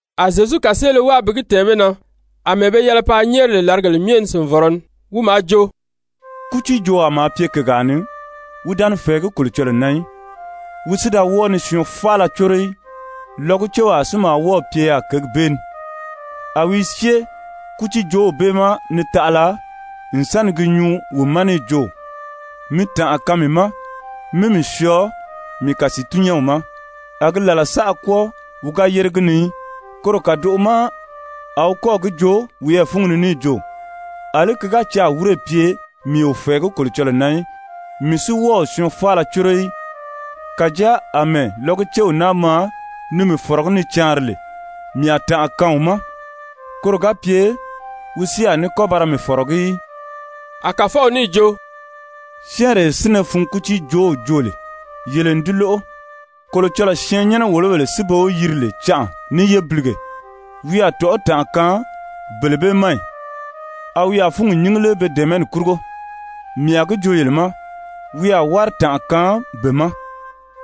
A Zyezu kàseele wáa bi gi tɛ̀ɛn be na àmɛɛ be yɛlɛ paa nyɛ́ɛri lè làrigèle myɛ ni sìnvɔrɔ ni. Wi maa jo: «Kútiijoowaa maa pye kègaa ni, wi da ni fɛ̀ɛgí Kolocɔlɔɔ na í, wi si da wɔ́ɔ ni syɔɔn faala córo í. Lɔgucewaa si maa wɔ́ɔ̀ pye yaà kěgi bee ni, a wi i syée kútiijoow bee ma ni taʔala n sa ni gi nyuu wi ma níì jo: ‹Mi tànʔa kaan mii ma, mí mii syɔɔ mii kàsiitun-nyɛ́nw ma.› A gi làla saʔa kwɔ́ɔ wi ga yére gi ni í. Koro kàdoʔo ma a wi kɔ́ɔ̀ gi joo wiyɛɛ fúngi ni níì jo: ‹Alí ki ga caa wírè pye mii o fɛ̀ɛgí Kolocɔlɔɔ na í, mii si wɔ́ɔ o syɔɔn faala córo í, kàjáa àmɛɛ lɔgucew naa maa ni mii fɔ̀rɔgí ni caanri lè, mii a tànʔa kaan wi ma, koro ga pye wi si a ní kɔ́ ba ra mii fɔ̀rɔgí í.›» A Kàfɔw níì jo: «Syɛ́ɛnree sínnɛ fun kútiijoow joo lè, yele n di lóʔo. Kolocɔlɔɔ syɛɛnnyɛnɛ-wòlobèle si be wi yiri lè canʔa ní yébilige, wi a tɔ̀ʔɔ́ tànʔa kaan bele bee ma ì? A wi a fúngi nyíngi lé be dɛ̀ɛmɛni kurugo? Mii a gi joo yele ma, wi a wári tànʔa kaan be ma.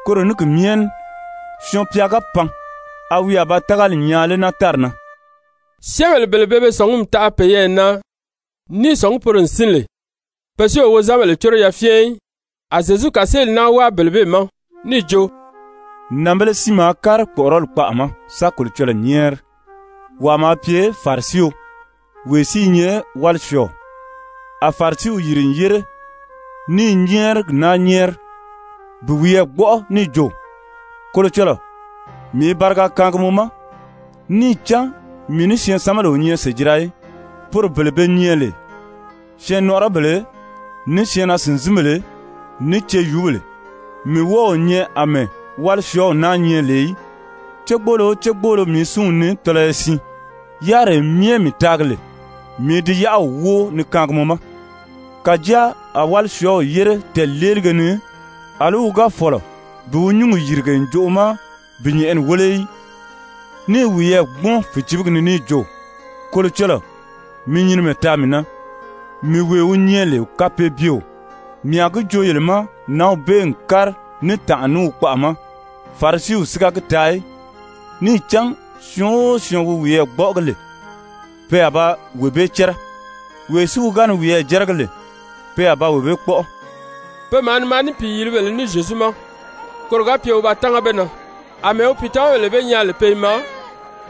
Koro ní ki myɛ ní Syɔɔn-pya ga pan, a wi a ba tágali nyaa lé naa tári na?» Syɛ́ɛnbèle bele pe be sɔ̀ngumi taʔa peyɛɛ na ní i sɔ̀ngí poro n sín lè, pe si o wozanbèle córo yafyɛn í, a Zyezu kàseeli naa wáa bele bee ma níì jo: «Nànbēle siin maa kári kpɔ́ʔɔrɔli kpaʔa ma sa Kolocɔlɔɔ nyɛ́ɛri. Wàa maa pye Farisio, wee si i nyɛ wálisyɔɔɔ. A Farisiw yìri n yére ní i nyɛ́ɛrigi naa nyɛ́ɛri bi wiyɛɛ gbɔ́ʔɔ níì jo: ‹Kolocɔlɔɔ, mii i bariga kaangi mɔ ma, níì cán mii ní syɛɛnsanbèle o nyɛ sèjira í, poro bele be nyɛ lè syɛɛnnɔʔɔrɔbèle, ní syɛɛnnaa-sìnzinbèle, ní ceyuubèle, mii wɔ́ɔ o nyɛ àmɛɛ wálisyɔɔw naa nyɛ lè í. Cégboolo o cégboolo mii i súnw nii tɔlɔyɔ siin, yáriree myɛ mii taagi lè, mii i di yáʔaw wóo ni kaangi mɔ ma.› Kàjáa a wálisyɔɔw yére tɛɛ̀leelige ni, àlí wi ga fɔ̀lɔ bi wi nyúngi yìrige ǹjoʔo ma bi nyɛ̀ʔɛni wéle í, ní i wiyɛɛ gbúmɔn fìcibigi ni níì jo: ‹Kolocɔlɔɔ, mi nyinimɛ taa mii na, mii wee wi nyɛ lè kapeebyeo.› Mii a gi joo yele ma, nǎnw bee n kári ní tànʔa ní wi kpaʔa ma, Farisiw si ga gi taa í. Níì cán syɔɔn o syɔɔn wi wiyɛɛ gbɔ́ʔɔgi lè, pe a ba wee bee cɛ́rɛ, wee si wi ga ni wiyɛɛ jɛ́rɛgi lè, pe a ba wee bee kpɔ́ʔɔ.» Pe maa ni maa ní pìiyilibèle ní Zyezu ma koro ga pye wi ba tánga be na. Amɛɛ wi pìitamabèle be nyaa lè pe i maa,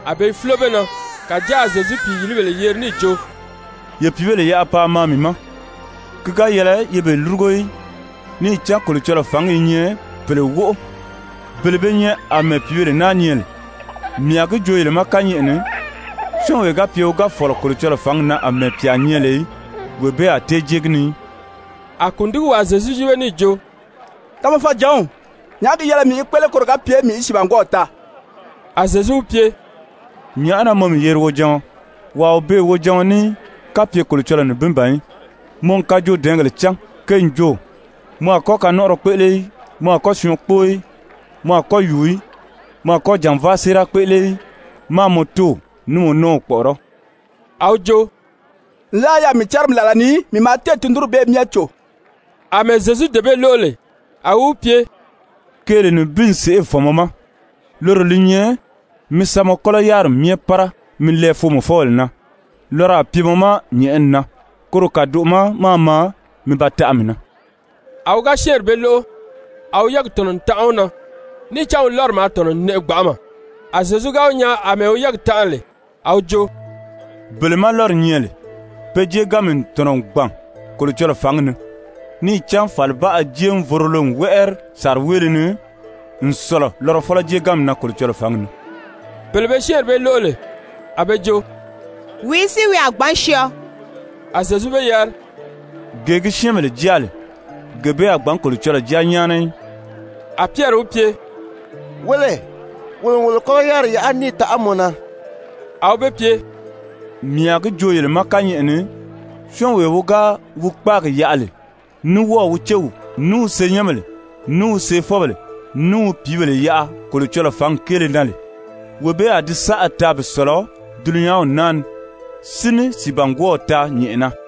a be i fúlo be na. Kàjáa a Zyezu pìiyilibèle yeri níì jo: «Ye pìíbèle yaʔa paa maa mii ma, ki ga yɛlɛ ye be lúrugo í. Níì cán Kolocɔlɔɔ fǎngi i nyɛ pèle wóʔo, bele be nyɛ àmɛɛ pìíbèle naa nyɛ lè. Mii a gi joo yele ma kányɛʔɛ ni, syɔ́ɔnwee ga pye wi ga fɔ̀lɔ Kolocɔlɔɔ fǎngi na àmɛɛ pyà nyɛ lè í, wee bee a tée jée gi ni í.» A kùndigiwaa Zyezu yíbe níì jo: «Tamafɔjǎnw, nyàʔá gi yɛlɛ mii í kpéʔele koro ga pye mii í sìibangwɔɔw taa?» A Zyezu wi pye: «Nyàʔá na mɔ mii yeri wojaɔn? Wàa o beè wojaɔn ní í, kapye Kolocɔlɔɔ nibin ban í. Mɔ n kajoodɛɛngèle cán, ke n jo: ‹Mɔ a kɔ́ kanɔnʔɔrɔ kpéʔele í. Mɔ a kɔ́ syɔɔn kpóo í. Mɔ a kɔ́ yùu í. Mɔ a kɔ́ jànvaa séera kpéʔele í. Máā mɔ tóow ní mɔ nɔ́ɔw kpɔ̀ʔɔrɔ́.›» A wi jo: «Nlaa yaà mii cárimi làla ni, mii n tundunri bee myɛ cò.» Amɛɛ Zyezu dee bee lóʔo lè, a wi wi pye: «Keele nibin n sèʔê fɔ̀n mɔ ma, loro li nyɛ mi sa mɔ kɔ́lɔ yáriri myɛ pára mi lɛɛ foomɔfɔbèle na, lɔrɔ a pye mɔ ma nyɛ̀ʔɛni na. Koro kàdoʔo ma máā maa mi ba taʔa mii na.» A wi ga syɛ́ɛnri bee lóʔo, a wi yɛ́ɛgi tɔ̀nɔ n tanʔa wi na, níì cán wi lɔ́ri maa tɔ̀nɔ n nɛʔɛ gbanʔama. A Zyezu ga wi nyaa àmɛɛ wi yɛ́ɛgi tanʔa lè, a wi jo: «Bele má lɔ́ri nyɛ lè, pe jéeganmi n tɔ̀nɔ n gbàn Kolocɔlɔɔ fǎngi ni. Níì cán fàlibaʔa jéevorolo n wɛ́ʔɛri sàriweele ni n sɔ̀lɔ lɔrɔfɔlɔ jéeganmi na Kolocɔlɔɔ fǎngi ni.» Bele be syɛ́ɛnri bee lóʔo lè, a be jo: «Wìí si wi a gbǎn syɔɔ?» A Zyezu be yari: «Gee gi syɛ́ɛnbèle jáa lè, gee bee a gbǎn Kolocɔlɔɔ jáa nyáana í.» A Pyɛri wi pye: «Wéle, wolo n wolo kɔ́lɔ yáriri yaʔa níì taʔa mɔ na.» A wi be pye: «Mii a gi joo yele ma kányɛʔɛ ni, syɔ́ɔnwee wi ga wi kpáagi yaʔa lè ní wɔ́ɔ̀ wi céw, ní wi senyɛnbèle, ní wi seefɔbèle, ní wi pìíbèle yaʔa Kolocɔlɔɔ fǎngi kéele na lè, wee bee a di saʔa taa bi sɔ̀lɔ dulunyanw naa ni, si ní sìibangwɔɔw taa nyɛ̀ʔɛna.»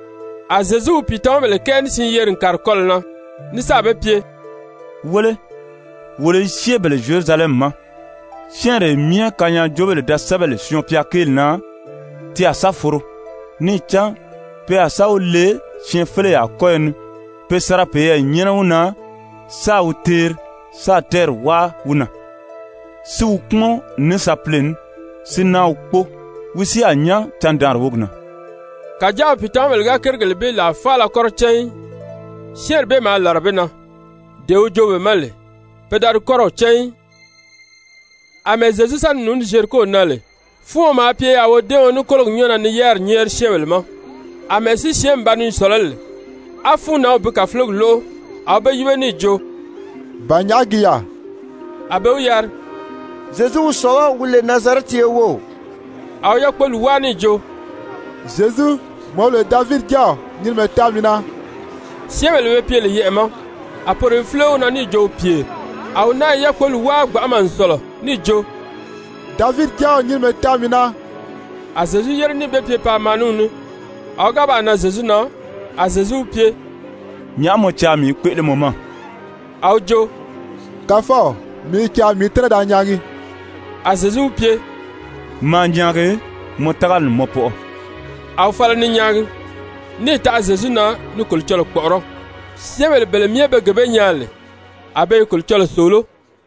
A Zyezu wi pìitamabèle kɛɛ ní siin yeri n kàri kɔlɔ̀ na ní sáà be pye: «Wéle, wolo i syée bele Zyerusalɛmi ma. Syɛ́ɛnree myɛ kanyaajoobèle da sɛ́bɛ lè Syɔɔn-pya kéeli na, ti a sa foro. Níì cán pe a sa wi le syɛɛnfeleyaa kɔ́yɔ ni pe sa ra peyɛɛ nyɛ́nɛ wi na, sáā wi teeri, sáā tɛ́ɛri wáa wi na, si wi kpúmɔn ní sapile ní, si náa wi kpóo. Wi si a nyán candaanri wógi na.» Kàjáa wi pìitamabèle ga kérigèle bee làa faala kɔ́rɔ cán í. Syɛ́ɛnri bee maa làra be na. Dee wi joo be ma lè, pe da di kɔ́rɔw cán í. Amɛɛ Zyezu sa ni nùuní Zyeriko na lè, fúuɔn maa pye yaà wodɛ́ɛɔn ní kólogi nyɔ́ɔ na ni yáriri nyɛ́ɛri syɛ́ɛnbèle ma. Amɛɛ si syɛ́ɛnmi ba ni sɔ̀lɔ́ lè á fúunnanw bi kàfulogi lóʔo, a wi be yíbe níì jo: «Ba nyàʔá gi yaà?» A be wi yari: «Zyezu wi sɔ̀lɔ́, wi lè Nazarɛti ye wów.» A wi yákpoli wáa níì jo: «Zyezu, mɔ wi lè Davidi Jáaw, nyinimɛ taa mii na.» Syɛ́ɛnbèle be pye lè yɛʔɛ̀ ma, a poro i fúlo wi na níì jo wi pyèri. A wi náa i yákpoli wáa gbanʔama n sɔ̀lɔ níì jo: «Davidi Jáaw, nyinimɛ taa mii na.» A Zyezu yére níì be pye paa maa ní wi ní. A wi ga baa nan Zyezu na, a Zyezu wi pye: «Nyàʔá mɔ caa mii í kpéʔele mɔ ma?» A wi jo: «Kàfɔw, mii i caa mii í tɛ́nɛ da nyaagi.» A Zyezu wi pye: «Maa nyaagi, mɔ tágali n mɔ pɔʔɔ.» A wi fala ni nyaagi, níì taʔa Zyezu na ni Kolocɔlɔɔ kpɔ̀ʔɔrɔ́. Syɛ́ɛnbèle bele myɛ be gee bee nyaa lè, a be i Kolocɔlɔɔ sòoló.